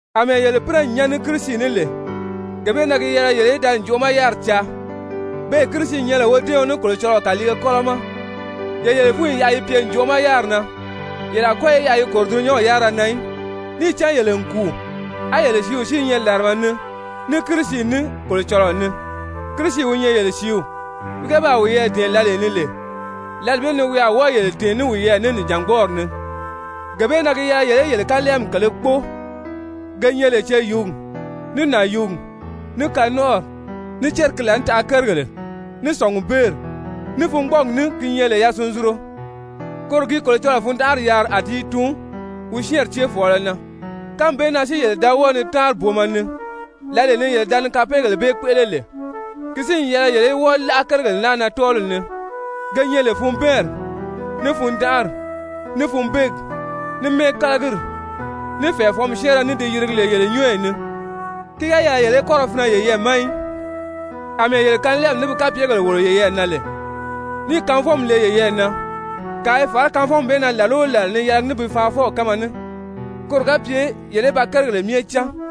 Amɛɛ yele pínɛ n nyán ní Kirisi ní lè, gee bee na gi yɛlɛ yele í da ǹjoʔo ma yáriri caa, beè Kirisi nyɛ lè wodɛ́ɛɔn ní Kolocɔlɔɔ kàliige kɔ́lɔ ma. Ye yele fúnyi yaʔa yi pye ǹjoʔo ma yáriri na, yele a kɔ́ yi yaʔa yi kòro dulunyanw yárira na í. Níì cán yele n kùu, á yele sìíw si i nyɛ làrama ni ní Kirisi ní, Kolocɔlɔɔ ni. Kirisi wi nyɛ yele sìíw, wi ga baa wiyɛɛ dɛ̀ɛn lǎlee ni lè, lǎli bee ni wi a wɔ́ɔ yele tɛ̀ɛn ní wiyɛɛ ní nìjangbɔɔri ni. Gee bee na gi yɛlɛ yele í yele kanlɛɛmi kèlē kpóo ge nyɛ lè ceyuugi, ní nànyuugi, ní kanɔnʔɔri, ní céri ki laànitaʔa kérigèle, ní sɔ̀ngubeeri, ní fungbɔɔgi ní, ki nyɛ lè yasunzunro. Koro gi Kolocɔlɔɔ fundanʔari yaari a ti i tuun [wi syɛ́ɛnri céefɔɔlɔ na]. Kánmi bee na si yele da wɔ́ɔ ni táanri booma ni, lǎlee ni yele da ni kapeegèle bee kpéʔele lè. Ki si n yɛlɛ yele í wɔ́ɔ láʔa kérigèle naa na tɔ́ɔliw ni, ge nyɛ lè: funbɛɛnri, ní fundanʔari, ní funbeegi, ní mɛ́ɛkalagiri, ní fɛ̀ɛfɔnmi syɛ́ɛnrɛ ní di yirigi lè yele nyɔ́ɔyi ni. Ki ga yɛlɛ yele í kɔ́ ra finɛ yeyɛɛ ma í, àmɛɛ yele kanlɛɛmi ní bi kapyegèle wòlo yeyɛɛ na lè, níì kanvɔnmi le yeyɛɛ na, kàa i fàrá kanvɔnmi bee na làla o làla ni yɛlɛgi ní bi faanfɔw kánma ní, koro ga pye yele í ba kérigèle myɛ cán.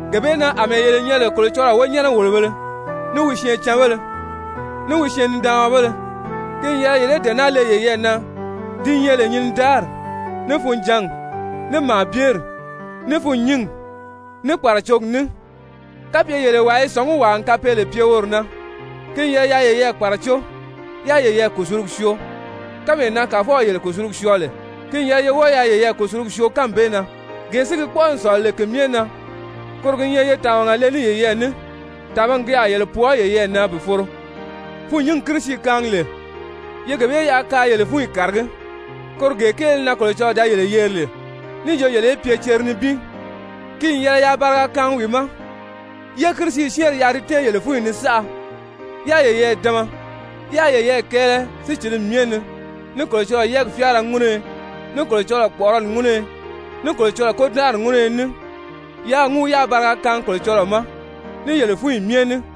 Gee bee na, àmɛɛ yele nyɛ lè Kolocɔlɔɔ wonyɛnɛ-wòlobēle, ní wi syɛɛncanbéle, ní wi syɛɛn-nidaanmabéle, ki n yɛlɛ yele í dee naa le yeyɛɛ na, di nyɛ lè nyinidaari, ní funjǎngi, ní màabyeri, ní fûnnyingi, ní kpàracogi ní. Kapye yele wàa i sɔ̀ngí wàa n kapeele pye woro na, ki n yɛlɛ yaa yeyɛɛ kpàracó yáā yeyɛɛ kùsulugi syoo. Kánmee na Kàfɔw yele kùsulugi syɔɔ lè, ki n yɛlɛ ye wɔ́ɔ yaa yeyɛɛ kùsulugi syoo kánmi bee na. Gee si gi kpɔ́ʔɔ n sɔ̀lɔ lè ki myɛ na, koro gi nyɛ ye tàmaga le ní yeyɛɛ ní, tàmagi ki a yele pwɔɔ yeyɛɛ na bi foro. Fûnnyingi Kirisi kaangi lè, ye gee bee yaʔa kaa yele fúnyi kàragí, koro gee kéele na Kolocɔlɔɔ da yele yeri lè níì jo yele í pye cere nibin. Ki n yɛlɛ yaa bariga kaangi wi ma. Yé Kirisi syɛ́ɛnri yaʔa di tɛ́ɛn yele fúnyi ni saʔa, yáā yeyɛɛ dama, yáā yeyɛɛ kɛɛlɛ sícilimi myɛ ni ní Kolocɔlɔɔ yɛ́ɛgi fyáara ŋúnuyo, ní Kolocɔlɔɔ kpɔ̀ʔɔrɔli ŋúnuyo, ní Kolocɔlɔɔ kôdanʔari ŋúnuyo ní. Yaa ŋúu yáā bariga kaangi Kolocɔlɔɔ ma ní yele fúnyi myɛ ní.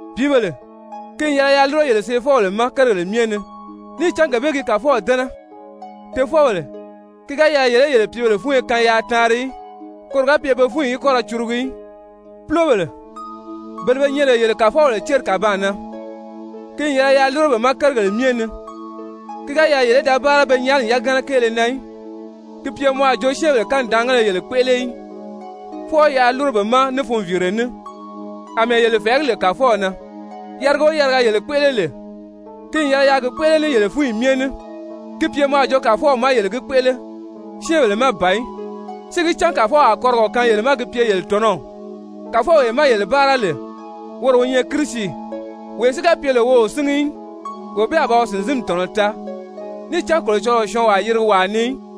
Pìíbèle, ki n yɛlɛ yaa lúro yele seefɔbèle ma kérigèle myɛ ni, níì cán gee bee gi Kàfɔw dɛ́nɛ. Tofɔbèle, ki ga yɛlɛ yele í yele pìíbèle fúnyo kaan yaa taanri í, koro ga pye pe fúnyi í kɔ́ ra curugu í. Púlobèle, bele be nyɛ lè yele kàfɔbèle céri kàbaan na, ki n yɛlɛ yaa lúro be ma kérigèle myɛ ni, ki ga yɛlɛ yele í da báara pe nyaani yagana kéele na í, ki pye mɔ a jo syɛ́ɛnbèle kanidaangéle yele kpéʔele í, fwɔɔ yaa lúro be ma ní funviire ní, àmɛɛ yele fɛ̀ɛgí lè Kàfɔw na. Yariga o yariga yele kpéʔele lè, ki n yɛlɛ yaa gi kpéʔele ní yele fúnyi myɛ ní, ki pye mɔ a jo Kàfɔw má yele gi kpéʔele, syɛ́ɛnbèle má ban í, si gi cán Kàfɔw a kɔrigɔ kaan yele ma ki pye yele tɔ̀nɔw. Kàfɔwee má yele báara lè, woro wi nyɛ Kirisi. Wee si ga pye lè wi o síngi í, wee bee a ba wi sìnzinmi tɔ̀nɔ taa, níì cán Kolocɔlɔɔ o syɔɔnwaa yirigi wàa ni í.